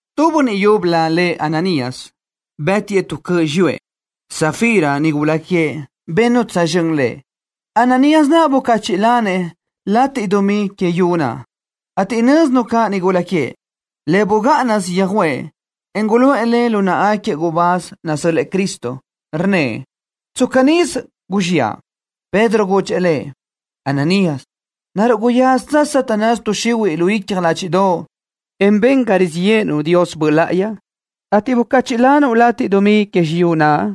Tu bönniʼ yúbölö lëʼ Ananías, bë́tiʼë tu cöʼ xiyúëʼ. Safira, nigula queëʼ, bennu tsözxö́n lëʼ. Ananías naʼ bucachiʼ lanëʼ lateʼ dumí que yu naʼ, ateʼ nö́zinu caʼ nigula queëʼ. Le bugáʼanasö yöjuʼë, en guluʼë le lu náʼagaquiëʼ gubáz nasö́l-lëʼë Cristo. Rnnëʼ: —Tsca nisö guzxiʼa. Pedro gudxëʼ lëʼ: —Ananías, ¿naruʼ guyázatsö Satanás tuʼ xihuiʼ lu icja ládxiʼdoʼo, en ben ga rizíʼ yéʼenuʼ Dios Böʼ Láʼayi, ateʼ bucachiʼ lanuʼ lateʼ dumí que xiyúʼ naʼ?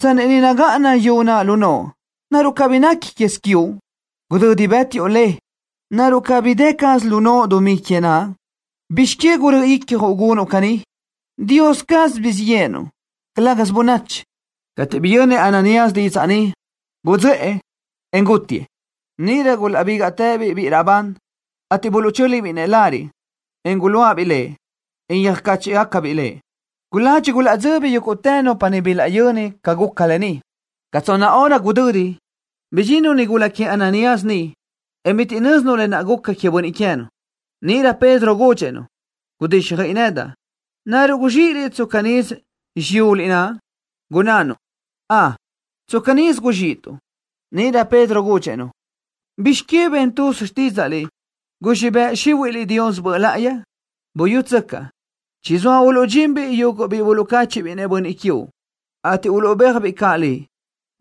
Tsanni niʼ nagáʼana yu naʼ lu noʼo, ¿naruʼ cabí nequi quez quiuʼ? Gudödi bë́tiʼu le, ¿naruʼ cabí dë caz lu noʼo dumí que naʼ? ¿Bizx que gurö́ʼö icjuʼ gunuʼ caní? Dios caz guzxíʼ yéʼenuʼ, calë́gasö bönachi. Cateʼ biyönnëʼ Ananías didzaʼ ni, gudzöʼë, en gútitëʼ. Níʼirö gulaʼbígaʼtëbiʼ biʼi raʼbán, ateʼ buluʼchö́libiʼ lëʼ lariʼ, en guluáʼabiʼ lëʼ, en yöjcáchiʼgacabiʼ lëʼ. Guladxi gulaʼdzöbi yúguʼtë nupa niʼ bilaʼyöni ca guca lë ni. Ca tsonna hora gudödi niʼ, bidxinnu nigula queëʼ Ananías naʼ niʼ, en bitiʼ nö́zinu lë naʼ guca queëʼ bönniʼ queë́nu. Níʼirö Pedro gudxëʼ-nu: —Gudíxjöiʼi nedaʼ. ¿Naruʼ guzxíʼiliʼ tsca nisö xiyuliʼ naʼ? Gunnánu: —Ön, tsca nisö guzxíʼituʼ. Níʼirö Pedro gudxëʼ-nu: —¿Bizx que ben tuz xtídzaʼliʼ guzxíʼ bëʼ xíhuiʼliʼ Dios Böʼ Láʼayi? Buyútsöcaʼ. Chizóa uluʼdxinbiʼ yuguʼ biʼi buluʼcáchiʼbiʼ-nëʼ bönniʼ quiuʼ, ateʼ uluʼbéajbiʼ caʼ liʼ.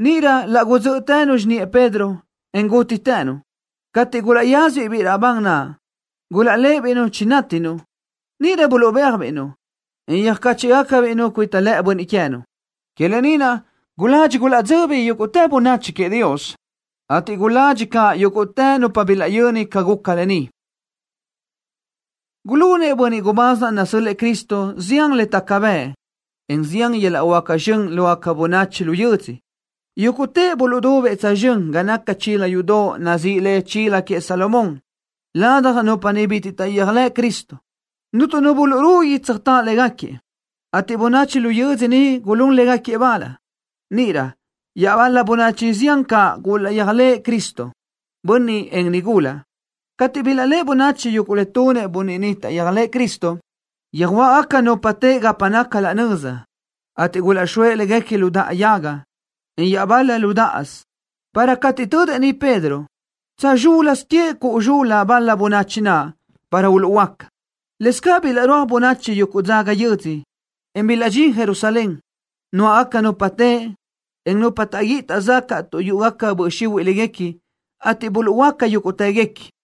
Níʼirö laʼ gudzö́ʼtënu xiniʼë Pedro, en gútitënu. Cateʼ gulaʼyázabiʼ biʼi raʼbán naʼ, gulaʼléʼebiʼ-nu chinátinu. Níʼirö buluʼbéajbiʼ-nu, en yöjcáchiʼgacabiʼ-nu cuita lëʼë bönniʼ queë́nu. Que lë ni naʼ guladxi gulaʼdzöbi yúguʼtë bönachi queëʼ Dios, ateʼ guladxi caʼ yúguʼtë nupa bilaʼyöni ca guca lë ni. Gulunëʼ bönniʼ gubáz naʼ nasö́l-lëʼë Cristo zián le taca bëʼ, en zián yöl-laʼ huáca zxön lógaca bönachi lu yödzö. Yúguʼtëʼ buluʼdubëʼ tsözxö́n ga naca chila yudoʼ nazíʼi le Chila Queëʼ Salomón. Ladaj nupa niʼ bitiʼ taʼyéajlëʼ Cristo, cuntu nu burugui tsöjtáʼ légaquiëʼ, ateʼ bönachi lu yödzö niʼ gulún légaquiëʼ bal. Níʼirö iaʼbal-la bönachi zián caʼ gulaʼyéajlëʼ Cristo, bönniʼ, en nigula. Cateʼ bilaʼléʼe bönachi yuguʼ le tunëʼ bönniʼ niʼ taʼyéajlëʼë Cristo, yöjuáʼagaca nupa teʼe gapa naca laʼ nöza, ateʼ gulaʼxóëʼ léguequi lu daʼa yaga, en iaʼbal-la lu dáʼasö, para cateʼ tödëʼ niʼ Pedro, tsa zxúl-lasö queëʼ cuʼu zxul-la bal-la bönachi huëʼ naʼ, para uluʼhuöáca. Lëscaʼ bilaʼrúaj bönachi yuguʼ dzaga yödzö, en bilaʼdxín Jerusalén, nuáʼagaca nupa teʼe, en nupa taʼguíʼi taʼzacaʼ tuʼ yúʼugaca böʼ xihuiʼ léguequi, ateʼ buluʼhuöáca yúguʼtëguequi.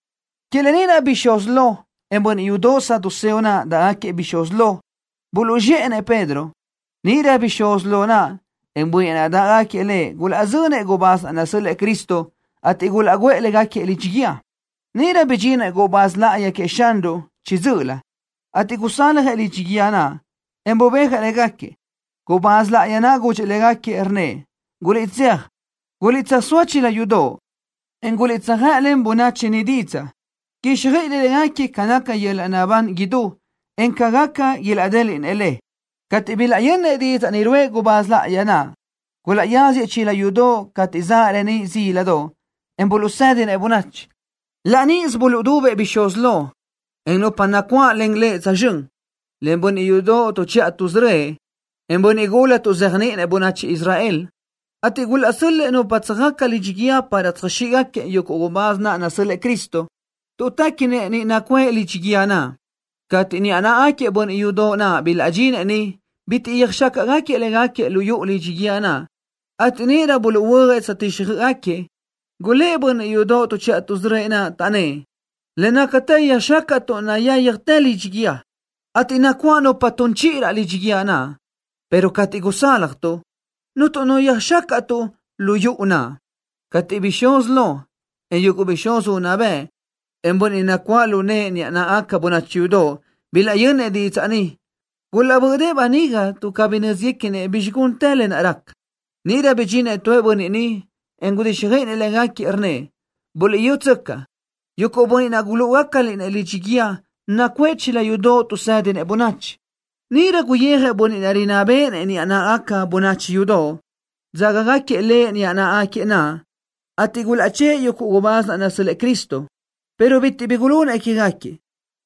Que lë ni naʼ bixúz lo, en bönniʼ yudoʼ saduceo naʼ dáʼgaquiëʼ bixúz lo, buluʼzxéʼenëʼ Pedro. Níʼirö bixúz lo naʼ, en bönniʼ naʼ dáʼgaquiëʼ lëʼ gulaʼzönëʼ gubáz naʼ nasö́l-lëʼë Cristo, ateʼ gulaʼguʼë légaquiëʼ lidxi guíë. Níʼirö bidxinëʼ gubáz láʼayi queëʼ Xanruʼ chiʼi dzö́ʼölö, ateʼ gusaljëʼ lidxi guíë naʼ, en bubéajëʼ légaquiëʼ. Gubáz láʼayi naʼ gudxëʼ légaquiëʼ, rnnëʼ: —Guliʼtséaj, guliʼtsöjsóa chila yudoʼ, en guliʼtsöjëʼlen bönachi niʼ didzaʼ, quíxjöiʼiliʼ légaquiëʼ ca naca yöl-laʼ naʼbán idú ni, en ca gaca ilaʼdéliʼnëʼ le. Cateʼ bilaʼyönnëʼ didzaʼ ni ruʼë gubáz láʼayi naʼ, gulaʼyáziëʼ chila yudoʼ cateʼ zaʼ reníʼ zíladoʼ, en buluʼsédinëʼ bönachi. Laʼ níʼisö buluʼdubëʼ bixúz lo, en nupa nacuáʼlen lëʼ tsözxö́n, len bönniʼ yudoʼ tuʼchiʼa tuʼsörö́ëʼ, en bönniʼ gula tuʼzéajniʼinëʼ bönachi Israel, ateʼ gulaʼsö́l-lëʼë nupa tsöjaca lidxi guíë para tsöjxíʼgaquiëʼ yuguʼ gubáz naʼ nasö́l-lëʼë Cristo, tuʼ téquinëʼ niʼ nacuʼë lidxi guíë naʼ. Cateʼ niʼa náʼagaquiëʼ bönniʼ yudoʼ naʼ bilaʼdxinëʼ niʼ, bitiʼ yöjxácaʼgaquiëʼ légaquiëʼ lu yuʼu lidxi guíë naʼ, ateʼ níʼirö buluʼhuö́ajëʼ tsöjtíxjöʼgaquiëʼ caʼ. Gulë́ʼ bönniʼ yudoʼ tuʼchiʼa tuʼsörö́ëʼ naʼ, taʼnnë́ʼ: —Le nácatë yöjxácaʼtuʼ nayáyajtë lidxi guíë, ateʼ nacuáʼ nupa tun chiʼi raʼ lidxi guíë naʼ, pero cateʼ gusálajtuʼ, cuntu nu yöjxácaʼtuʼ lu yuʼu naʼ. Cateʼ bixúz lo, en yuguʼ bixúz unná bëʼ, en bönniʼ nacuáʼ lu nëʼë niʼa náʼagaca bönachi yudoʼ, bilaʼyönnëʼ didzaʼ ni, gulaʼbö́ʼdëʼë böniga tuʼ cabí nö́ziguequinëʼ bizxi guntë lë naʼ raca. Níʼirö bidxinëʼ tu bönniʼ niʼ, en gudíxjöiʼinëʼ légaquiëʼ, rnnëʼ: —Buliʼyútsöcaʼ. Yuguʼ bönniʼ naʼ gulúʼugacaliʼ-nëʼ lidxi guíë nacuʼë chila yudoʼ tuʼsë́dinëʼ bönachi. Níʼirö guyijëʼ bönniʼ naʼ rinná béʼenëʼ niʼa náʼagaca bönachi yudoʼ, dzágagaquiëʼ lëʼ niʼa náʼagaquiëʼ naʼ, ateʼ gulaʼchë́ʼë yuguʼ gubáz naʼ nasö́l-lëʼë Cristo, pero bitiʼ bi gulunëʼ quégaquiëʼ,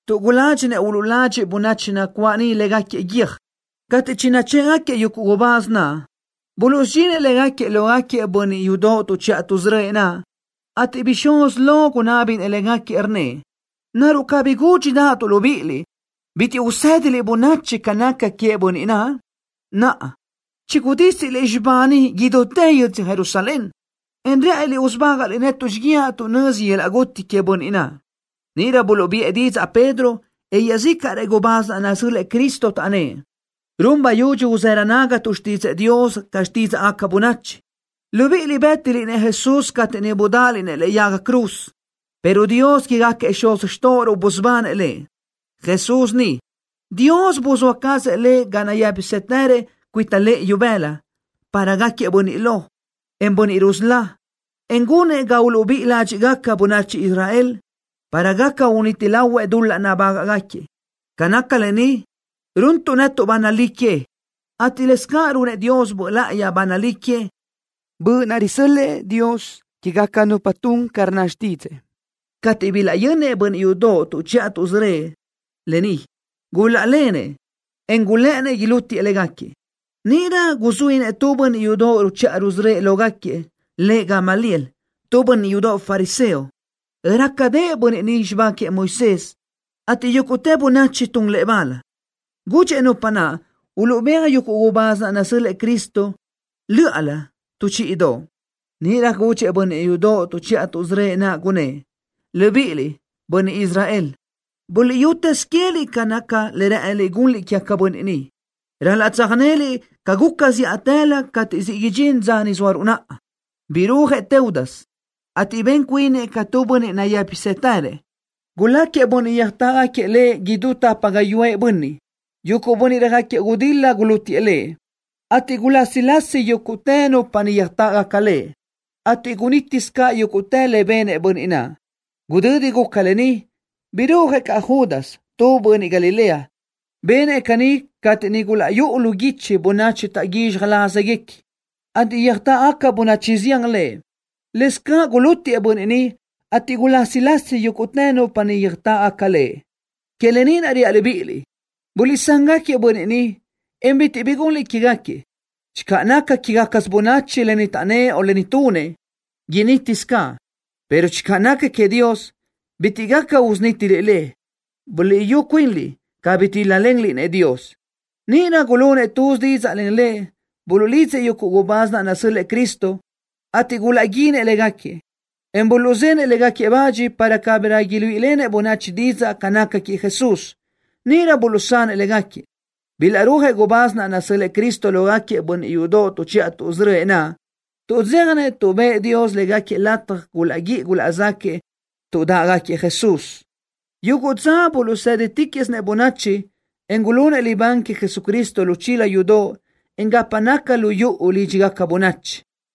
tuʼ guládxinëʼ uluʼladxiʼ bönachi nacuáʼ niʼ légaquiëʼ guiö́j. Cateʼ chinachë́ʼgaquiëʼ yuguʼ gubáz naʼ, buluʼsudxinëʼ légaquiëʼ lógaquiëʼ bönniʼ yudoʼ tuʼchiʼa tuʼsörö́ëʼ naʼ, ateʼ bixúz lo gunábinëʼ légaquiëʼ, rnnëʼ: —¿Naruʼ cabí gúdxidaʼatuʼ libíʼiliʼ bitiʼ usë́diliʼ bönachi ca naca queëʼ bönniʼ naʼ? Naʼa, chigudísiliʼ xibá ni idútë yödzö Jerusalén, en rë́ʼëniliʼ usubágaʼliʼ netuʼ xíguiaʼ tuʼ nözi yöl-laʼ guti queëʼ bönniʼ naʼ. Níʼirö buluʼbiʼë didzaʼ Pedro, en iaʼzícaʼrëʼ gubáz naʼ nasö́l-lëʼë Cristo, taʼnnë́ʼ: —Run bayudxi uzërö nágatuʼ xtídzëʼë Dios ca xtídzaʼgaca bönachi. Libíʼiliʼ bë́tiliʼ-nëʼ Jesús cateʼ niʼ budáʼaliʼ-nëʼ lëʼe yaga cruz, pero Dios quégaquiëʼ xuz xtóʼoruʼ busubanëʼ Lëʼ. Jesús ni, Dios buzóa cazëʼ Lëʼ ga nayë́pisëtërëʼ cuita lëʼë ibëla, para gáquiëʼ Bönniʼ Lo, en Bönniʼ Rusölá, en gunëʼ ga uluʼbíʼi ládxiʼgaca bönachi Israel, para gaca uniti lahuëʼ dul-laʼ nabágaʼgaquiëʼ. Ca naca lë ni, runtuʼ netuʼ ba nalí que, ateʼ lëscaʼ runëʼ Dios Böʼ Láʼayi ba nalí que, Böʼ naʼ risö́l-lëʼë Dios quégaca nupa tun ca rnna xtídzëʼë. Cateʼ bilaʼyönnëʼ bönniʼ yudoʼ tuʼchiʼa tuʼsörö́ëʼ naʼ lë ni, gulaʼlenëʼ, en gulë́ʼënnëʼ ilútiëʼ légaquiëʼ. Níʼirö guzuínëʼ tu bönniʼ yudoʼ ruchiʼa rusörö́ëʼ lógaquiëʼ, lëʼ Gamaliel, tu bönniʼ yudoʼ fariseo. Rácadëʼë bönniʼ ni xibá queëʼ Moisés, ateʼ yúguʼtë bönachi tun lëʼ bal. Gudxëʼ nupa naʼ uluʼbéaj yuguʼ gubáz naʼ nasö́l-lëʼë Cristo lö́ʼalö tu chíʼidoʼ. Níʼirö gudxëʼ bönniʼ yudoʼ tuʼchiʼa tuʼsörö́ëʼ naʼ, gunnë́ʼ: —Libiʼiliʼ, bönniʼ Israel, buliʼyutëz queë́liʼ ca naca le rë́ʼëniliʼ gunliʼ quégaquiëʼ bönniʼ ni. Ral-laʼ tsöjnéliʼ ca guca zíʼatëlö cateʼ siʼ idxín dza ni zóaruʼ naʼa. Birúajëʼ Teudas, ateʼ ben cuinëʼ ca tu bönniʼ nayë́pisëtërëʼ. Guláquiëʼ bönniʼ yöjtáʼgaquiëʼ lëʼ idú tapa gáyuʼë bönniʼ. Yuguʼ bönniʼ röjáquiëʼ gudil-la gulútiëʼ lëʼ, ateʼ gulásilasi yúguʼtë nupa niʼ yöjtáʼgaca lëʼ, ateʼ gunítisö caʼ yúguʼtë le benëʼ bönniʼ naʼ. Gudödi guca lë ni, birúajëʼ caʼ Judas, tu bönniʼ Galilea. Benëʼ caní cateʼ niʼ gulaʼyúʼu lu guichi bönachi taʼguízxaj lázagaquiëʼ, ateʼ yöjtáʼgaca bönachi zián lëʼ. Lëscaʼ gulútiëʼ bönniʼ ni, ateʼ gulásilasi yúguʼtë nupa niʼ yöjtáʼgaca lëʼ. Que lë ni naʼ reaʼ libíʼiliʼ: Guliʼsán-gaquiëʼ bönniʼ ni, en bitiʼ bi gunliʼ quégaquiëʼ. Channö naca quégacasö bönachi lë ni taʼnnë́ʼ o lë ni tunëʼ, initi caz, pero channö naca queëʼ Dios, bitiʼ gaca usunítiliʼ le. ¡Buliʼyú cuinliʼ cabí tíl-lalenliʼ-nëʼ Dios! Níʼirö gulunëʼ tuz didzaʼ len lëʼ. Buluʼlidzëʼ yuguʼ gubáz naʼ nasö́l-lëʼë Cristo, ateʼ gulaʼguínëʼ légaquiëʼ, en buluʼzenëʼ légaquiëʼ bach para cabirö iluíʼilenëʼ bönachi didzaʼ ca naca queëʼ Jesús. Níʼirö buluʼsanëʼ légaquiëʼ. Bilaʼrúajëʼ gubáz naʼ nasö́l-lëʼë Cristo lógaquiëʼ bönniʼ yudoʼ tuʼchiʼa tuʼsörö́ëʼ naʼ. Tuʼdzéjanëʼ tuʼ bëʼë Dios légaquiëʼ lataj gulaʼguíʼi gulaʼzáquëʼë tuʼ dáʼgaquiëʼ Jesús. Yuguʼ dza buluʼsë́ditiquiʼsinëʼ bönachi, en gulunëʼ libán queëʼ Jesucristo lu chila yudoʼ, en gapa naca lu yuʼu lídxigaca bönachi.